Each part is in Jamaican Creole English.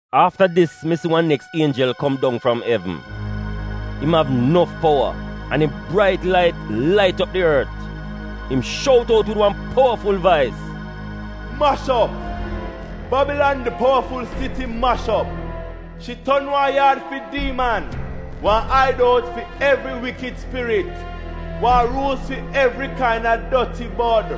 Afta dis, mi si wan neks ienjel kom dong fram evn. Im av nof powa, an im brait lait lait op di ort. Im shout out wid wan powaful vais: “Mash op! Babilan di powaful siti mash op! Shi ton wan yaad fi diiman, wan aidout fi evri wikid spirit, wan ruus fi evri kaina doti bod.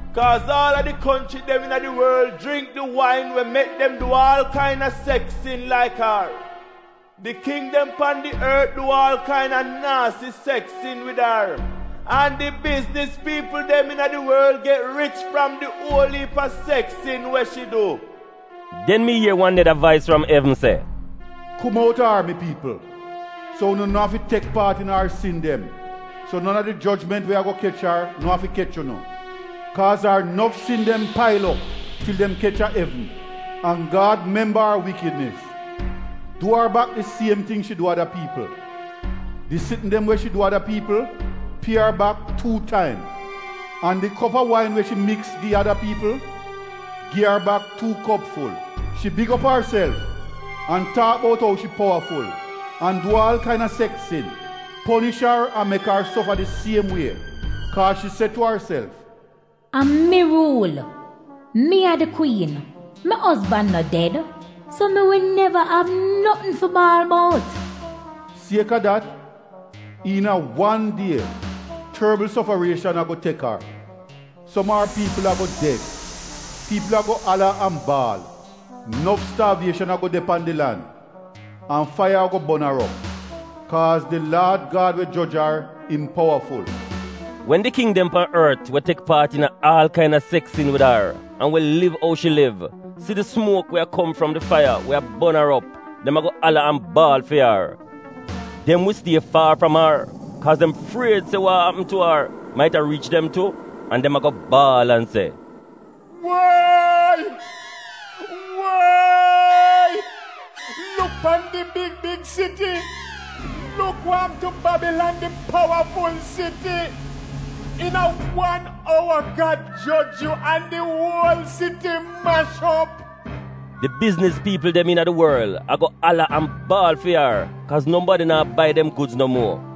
Kaaz aal a di konchri dem iina di worl jringk di wain we mek dem du aal kaina seks sin laik ar. Di king dem pan di ort du aal kaina naasi seks sin wid ar, an di bizniz piipl dem iina di worl get rich fram di uol iip a seks sin we shi du. Den mi ier wan neda vais fram evn se: “Kum outa ar, mi piipl, so unu no afi tek paat iina ar sin dem, so non a di jojment we ago kech ar na'afi kech unu; Kaaz ar nof sin dem pail op til dem kech a evn, an Gad memba ar wikidnis. Du ar bak di siem ting shi du ada piipl; di sitn dem we shi du ada piipl, pie ar bak tuu taim. An di kop a wain we shi miks gi ada piipl, gi ar bak tuu kop ful. Shi big op arself an taak bout ou shi powaful an du aal kaina seks sin. Ponish ar an mek ar sofa di siem wie, kaaz shi se tu arself, “A mi ruul. Mi a di kwiin. Mi ozban no ded, so mi wi neva av notn fi baal bout.” Sieka dat, iina wan die, torbl sofarieshan ago tek ar: som a ar piipl ago ded, piipl ago ala an baal, nof staavieshan ago de pan di lan. An faiya ago bon ar op, kaaz di Laad Gad we joj ar, im powaful. Wen di king dem pan ort we tek paat iina aal kaina seks sin wid ar an we liv ou shi liv, si di sumuok we a kom fram di faiya we a bon ar op, dem ago ala an baal fi ar. Dem wi stie faar fram ar kaaz dem fried se wa a apm tu ar maita riich dem tu. An dem ago baal an se, “Woyi! Woyi! Luk pan di big big siti! Luk wa apm tu Babilan di powaful siti! Iina wan owa Gad joj yu an di uol siti mash op!” Di bizniz piipl dem iina di worl ago ala an baal fi ar kaaz nobadi naa bai dem gudz no muo —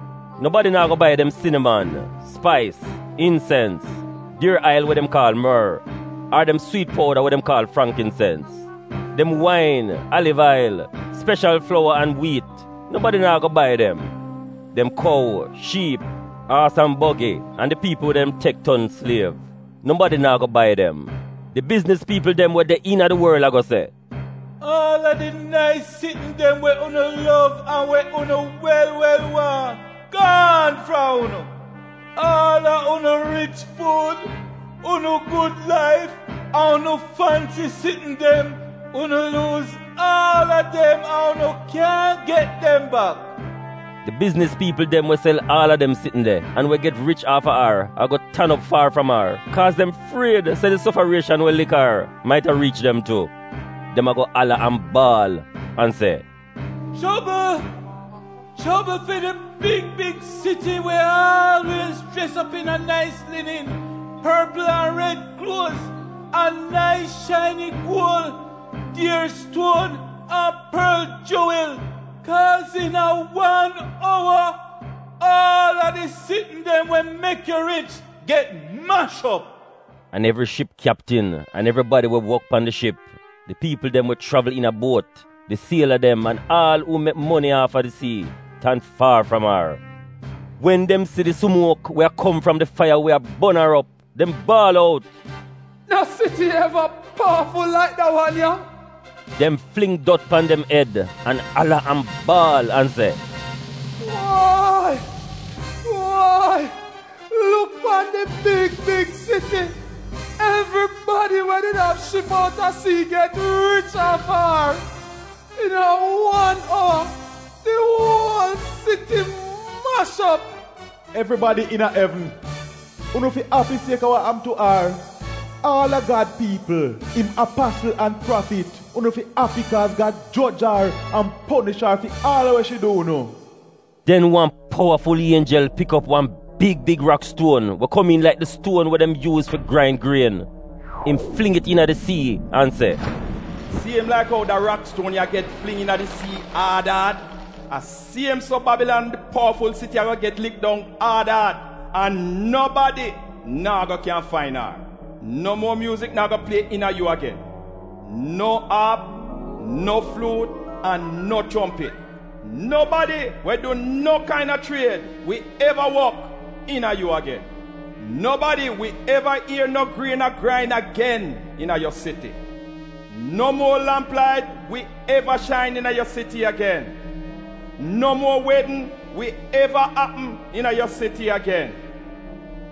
Nobadi naa go bai dem siniman, spais, insens, dier ail we dem kaal mor, ar dem swiit powda we dem kaal frangkinsens. Dem wain, aliv ail, speshal flowa an wiit, nobadi naa go bai dem. Dem kou, shiip, aas an bogi, an di piipl we dem tek ton sliev, nobadi naa go bai dem. “Di bizniz piipl dem we de iina di worl ago se ‘Aal a di nais sitn dem we unu lov an we unu wel wel waahn gaan fram unu. Aal a unu rich fuud, unu gud laif an unu fansi sitn dem, unu luuz aal a dem an unu kyaahn get dem bak.’ Di bizniz piipl dem we sel aal a dem sitn de, an we get rich aafa ar ago tan op faar fram ar, kaaz dem fried se di sofarieshan we lik ar maita riich dem tu. Dem ago ala an baal, an se, “ ‘Chobl! Chobl fi di big big siti, we aalwiez jres op iina nais linin, porpl an red kluoz, an nais shaini guol, dier stuon, an porl juwil! Kaaz iina wan owa aal a di sitn dem we mek yu rich get mash op!’ An evri ship kyaptin an evribadi we wok pan di ship, di piipl dem we chravl iina buot, di siela dem an aal uu mek moni aafa di sii, tan faar fram ar. Wen dem si di sumuok we a kom fram di faiya we a bon ar op, dem baal out, “No siti eva powaful laik da wan ya?” Dem fling dot pan dem ed, an ala, an baal an se: “ ‘Woyi! Woyi luk pan di big big siti. Evribadi we did av ship outa sii get rich aafa ar. Iina wan owa di uol siti mash op! Evribadi iina evn, unu fi api sieka wa apm tu ar! Aal a Gad piipl, im apasl an prafit, unu fi api! Kaaz Gad joj ar an ponish ar fi aal wa shi du unu.’” Den wan powaful ienjel pik op wan big big rakstuon we komiin laik di stuon we dem yuuz fi grain grien. Im fling it iina di sii an se, “Siem laik ou da rakstuon ya get fling iina di sii aad aad, a siem so Babilan di powaful siti ago get lik dong aad aad, an nobadi naa go kyan fain ar. No muo myuuzik naa go plie iina yu agen: no aap, no fluut an chompit. Nobadi we du no kaina chried wi eva wok iina yu agen. Nobadi wi eva ier no grien a grain agen iina yu siti. No muo lamp lait wi eva shain iina yu siti agen. No muo wedn wi eva apm iina yu siti agen.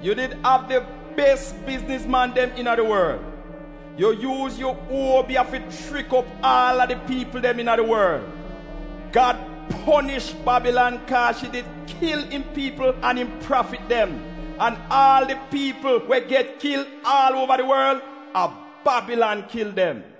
Yu did av di bes biznizman dem iina di worl. Yu yuuz yu obiya fi chrik op aal a di piipl dem iina di worl. Gad ponish Babilan kaaz shi did kil im piipl an im prafit dem, an aal di piipl dem we get kil aal uova di worl, a Babilan kil dem.”